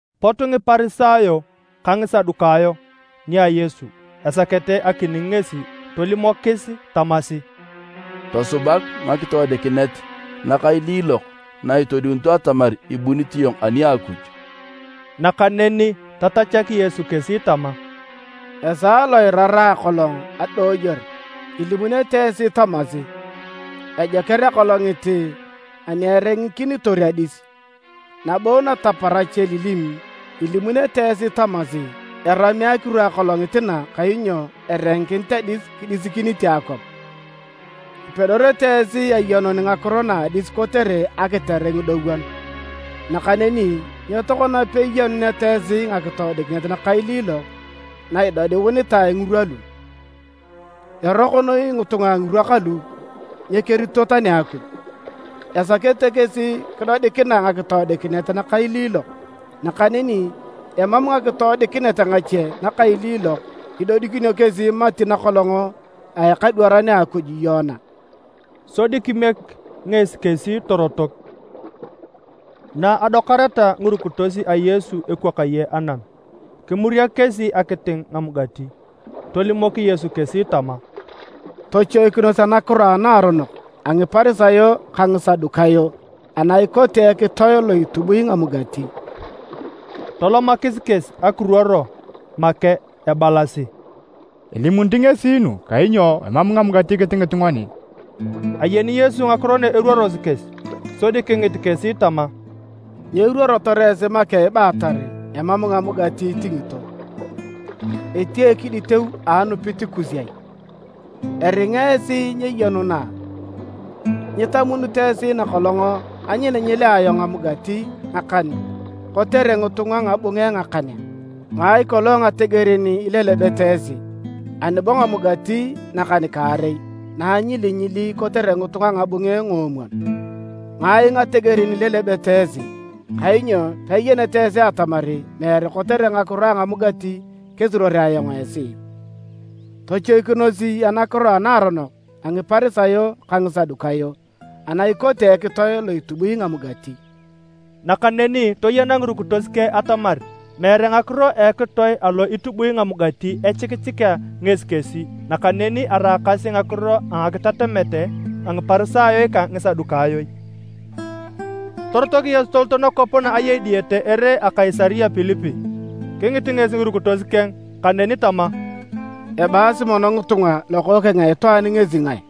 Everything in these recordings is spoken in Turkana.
Pot Ngiparisayo ka Ngisadukayo nia Yesu esakete akining ngesi. Tolimokis tamasi, “Tosubak ngakitoodikinet nakailiilok na itodiunito atamar ibunit iyong ani a Akuj.” Nakaneni tatachak Yesu kesi tama, “Esaa lo iraraa akolong adooyor ilimunete esi tamasi, ‘Ejoker akolongit ani erengikinitor adis’. Nabo nataparach elilim ilimunete esi tamasi, ‘Erami akiru akolongit na kainyo erengikinit adis kidiisikinite akwap’. Ipedorete esi ayenun ngakiro na adis kotere akitere ngidowon. Nakaneni nyo tokona peiyenuneta esi ngakitoodikinet nakailiilok na itodiunitae ngirwa lu! Eroko noi ngitunga a ngirwa kalu nyekerito tani Akuj! Esakete kesi kidodikinae ngakitoodikinet nakailiilok! Nakaneni emam ngakitoodikinet ngache nakailiilok idodikinio kesi mati nakolong a ekadwaran a Akuj Yona.” Sodi kimiek ngesi kesi torotok. Na adokareta ngirukitos a Yesu ekwakaye anam, kimuriak kesi akiting ngamugati. Tolimok Yesu kesi tama, “Tochoikinos anakiro anaaronok a Ngiparisayo ka Ngisadukayo ana ikote ekitoe lo itubui ngamugati.” Tolomakis kesi ekiruor make ebalasi, “Elimunit ngesi nu kainyo emam ngamugati kitingit ngoni.” Ayeni Yesu ngakiro na eruorosi kesi sodi kingit kesi tama, “Nyo iruorotor esi make ibaatar emam ngamugati itingito? Etia ekiditeu a anupit kus ai? Eringa esi nyeyenuna a? Nyitamunito esi nakolong anyilinyilia ayong ngamugati ngakan kotere ngitunga ngabunge ngakan a? Ngai kolong ngategerin ilelebete esi? Ani bo ngamugati nakan-kaarei na anyilinyili kotere ngitunga ngabunge ngoomwon? Ngai ngategerin ilelebete esi? Kainyo peiyeneta esi atamar meere kotere ngakiro a ngamugati kesuruorea ayong esi? Tochoikinos anakiro anaaronok a Ngiparisayo ka Ngisadukayo ana ikote ekitoe lo itubui ngamugati.” Nakaneni toyena ngirukitos keng atamar meere ngakiro a ekitoe alo itubui ngamugati echikichikea ngesi kesi nakaneni araakasi ngakiro a ngakitatamet a Ngiparisayo ka Ngisadukayo. Torotok Yesu tolot nakwap na ayei diyete ere a Kaisaria Pilipi. Kingit ngesi ngirukitos keng kaneni tama, “Ebaasi mono ngitunga Lokookeng a Itwaan ngesi ngae?”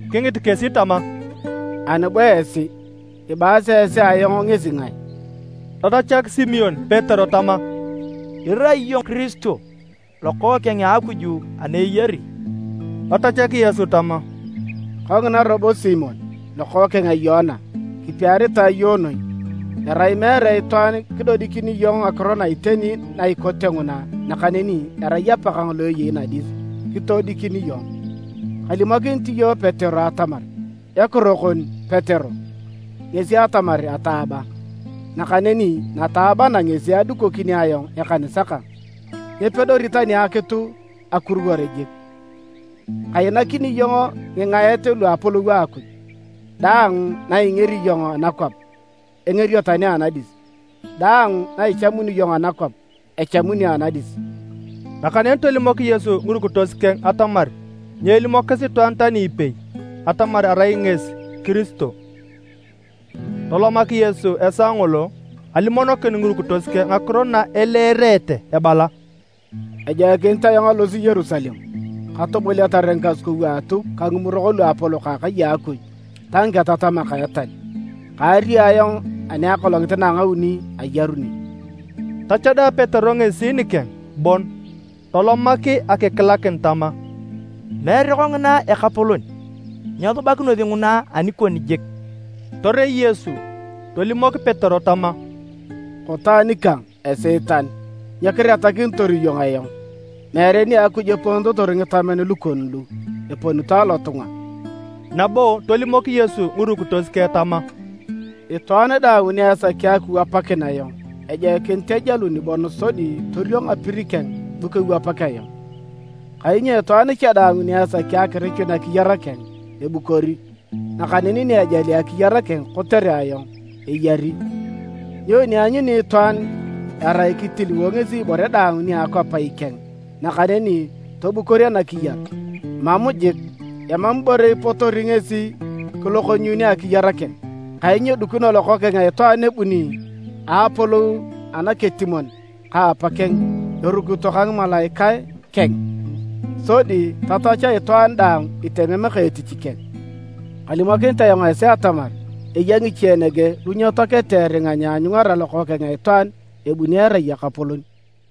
Kingit kesi tama, “Ani bo esi, ibaasi esi ayong ngesi ngae?” Tatachak Simon Petero tama, “Irai iyong Kiristo, Lokookeng a Akuj ana eyari.” Tatachak Yesu tama, “Kongina robo Simon, lokookeng a Yoana! Kipiaritae iyong noi. Erai meere itwaan kidodikini iyong ngakiro na iteni na ikote nguna nakaneni erai Apakang lo eyei nadis kitodikini iyong. Kalimokinit iyong Petero atamar, ekiro kon Petero, ngesi atamar ataaba. Nakaneni nataaba na ngesi adukokini ayong ekanisa kang. Nyepedori tani akitu akuruwor jik! Kainakini iyong ngingaet lu Apolou a Akuj. Daang na ingeri iyong anakwap, engerio tani anadis. Daang na ichamuni iyong anakwap, echamunio anadis.” Nakaneni tolimok Yesu ngirukitos keng atamar nyeelimokis itwaan tani ipei atamar arai ngesi Kiristo. Tolomak Yesu esaa ngolo alimonokin ngirukitos keng ngakiro na eleerete ebala, “Ejoikinit ayong alosi Yerusalem, katoboliatar ngikasukou a Atuk ka ngimurok luapolok a akai a Akuj ta ngiketatamak a etal. Kaario ayong ani akolongit na a ngauni ayaruni.” Tachada Petero ngesi nikeng bon tolomak akikilakin tama, “Meere kongina Ekapolon! Nyesubakinosi nguna anikon jik!” Torei Yesu tolimok Petero tama, “Koto anikang Esiitan! Nyo kiretakinitor iyong ayong? Meere nia Akuj eponitotor ngitamen lukon lu, eponito alotunga.” Nabo tolimok Yesu ngirukitos keng tama, “Itwaan daang ni esaki akiwapakin ayong, ejoikinit ejalun bon sodi toriong apir keng bu kewapak ayong. Kainyo itwaan cha daang ni esaki akirichun akiyar keng, ebukori. Nakaneni ni ejali akiyar keng kotere ayong, eyari. Nyoni eanyuni itwaan erai kitiliwo ngesi ibore daang nia akwap ikeng nakaneni tobukor anakiyar? Mam jik! Emam ibore ipotori ngesi kilokonyuunio akiyar keng. Kainyo dikino Lokookeng a Itwaan ebuni a Apolou anaketimon ka Apakeng erukito ka ngimalaikae keng. Sodi tatach itwaan daang itemem ka etich keng. Kalimokinit ayong esi atamar eya ngiche nege lu nyetoakete eringa nyeanyungara Lokookeng a Itwaan ebuni erai Ekapolon.”